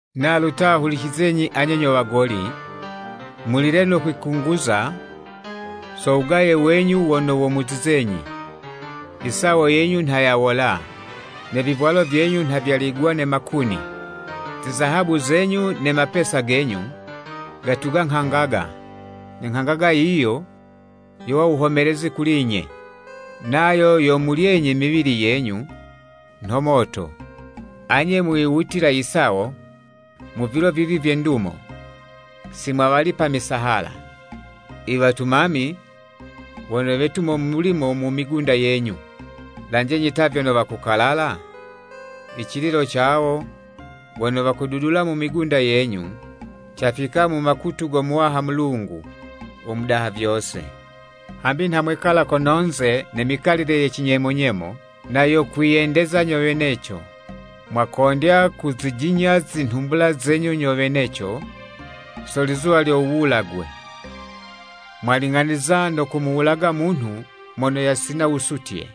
Nalu ta hulicizenyi anye nyo wagoli! Mulile no le kwikunguza so wugaye wenyu wono womuzizenyi. Isawo yenyu nha yawola, ne vivwalo vyenyu nha vyaligwa ne makuni. Zizahabu zenyu ne mapesa genyu, gatuga nghangaga, ne nghangaga yiyo yowa wuhomelezi kuli'nye, nayo yomulyenyi miwili yenyu nho moto. Anye mwiwutila isawo mu vilo vivi vye ndumo! Simwawalipa misahala i wetumami wono wetumo mulimo mu migunda yenyu. Lanjenyi ta vyono wakukalala? Icililo ca wawo wono wakududula mu migunda yenyu, cafika mu makutu go Muwaha Mulungu u Mudaha vyose. Hambi nha mwekala kono'nze ne mikalile ye cinyemo-nyemo na yo kwiyendeza nyo weneco. Mwakondya kuzijinya zinhumbula zenyu nyo weneco so lizuwa lyo wuwulagwe. Mwaling'anizwa no kumuwulaga munhu mono yasina wusutye,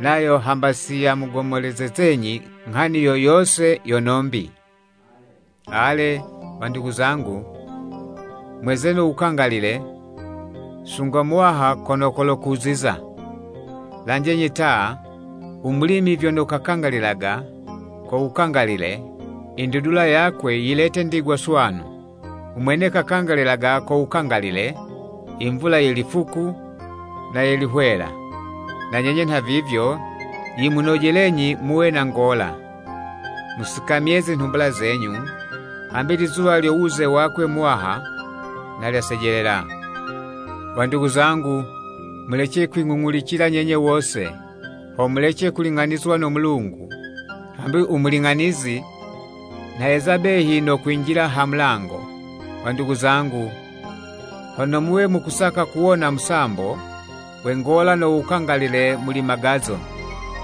nayo hamba siyamugomolezezenyi nghani yo yose yono'mbi. Ale, wandugu zangu, mweze no wukangalile sunga Muwaha kolo kokuziza. Lanjenyi ta u mulimi vyono kalindilaga ko wukangalile i ndudula yakwe yilete ndigwa swanu. Umwene kalindilaga ko wukangalile i mvula ye lifuku ne ye lihwela. Na nyenye nhavivyo yimunojelenyi muwe na ngola, musikamye zinhumbula zenyu, hambi lizuwa lyo wuze wakwe Muwaha nha lyasejelela. Wandugu zangu, mulece kwing'ung'ulicila nyenye wose, ho mulece kuling'anizwa no Mulungu. Hambi u Muling'anizi nha yeza behi no kwinjila ha mulango. Wandugu zangu, hono muwe mukusaka kuwona musambo we ngola no wukangalile muli magazo,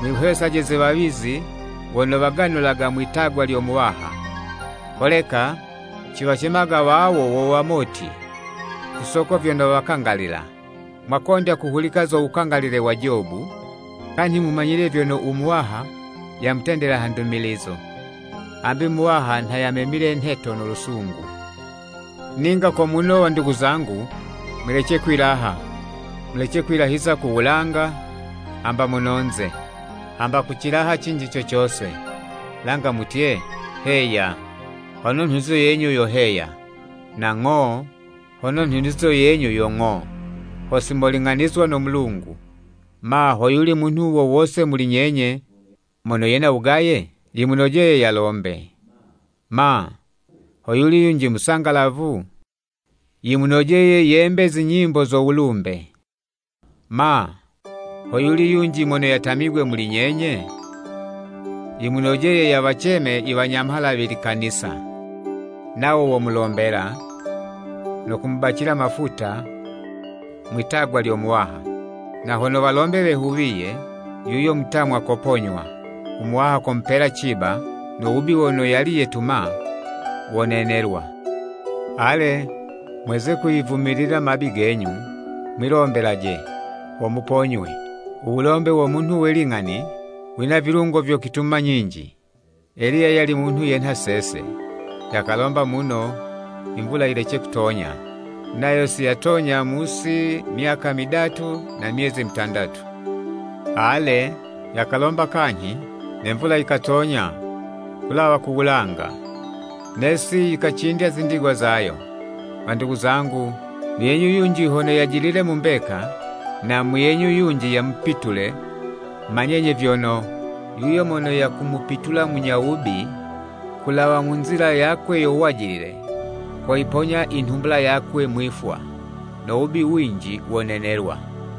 mwihwesaje ze wawizi wono waganulaga mwitagwa lyo Muwaha. Holeka ciwacemaga wawo wo wamoti ku soko vyono wakangalila. Mwakondya kuhulika zo wukangalile wa Jobu, kanyhi mumanyile vyono u Muwaha yamutendela ha ndumilizo. Hambi Muwaha nha yamemile nheto no lusungu. Ninga ko muno, wandugu zangu mulece kwilaha. Mulece kwilahiza ku wulanga, hamba mono'nze, hamba ku cilaha cinji co cose. Langa mutye “Heya” hono nhunizo yenyu yo heya, na “Ng'o” hono nhunizo yenyu yo ng'o, ho simoling'anizwa no Mulungu. Ma, hoyuli munhu wo wose muli nyenye mono yena wugaye? Yimunojeye yalombe. Ma, hoyuli yunji musangalafu? Yimunojeye yembe zinyimbo zo wulumbe. Ma, hoyuli yunji mono yatamigwe muli nyenye? Yimunojeye yawaceme iwanyamhala we Likanisa, nawo womulombela no kumubacila mafuta mwi'tagwa lyo Muwaha. Na hono walombe wehuwiye yuyo mutamwa koponywa, u Muwaha komupela ciba, no wubi wono yali yetuma wonenelwa. Ale, mweze kwiyivumilila mabi genyu, mwilombelaje, ho muponywe. Uwulombe wo munhu we ling'ani wina vilungo vyo kwituma nyinji. Eliya yali munhu yenha sese. Yakalomba muno imvula yilece kutonya, nayo siyatonya mu'si myaka midatu na myezi mutandatu. Ale, yakalomba kanyhi, ne mvula yikatonya kulawa ku wulanga, ne'si yikacindya zindigwa zayo. Wandugu zangu, muyenyu yunji hono yajilile mu mbeka, na muyenyu yunji yamupitule, manyenyi vyono, yuyo mono yakumupitula munyo wubi, ku wulawa mu nzila yakwe yo wajilile, koyiponya i nhumbula yakwe mwi'fwa, no wubi winji wonenelwa.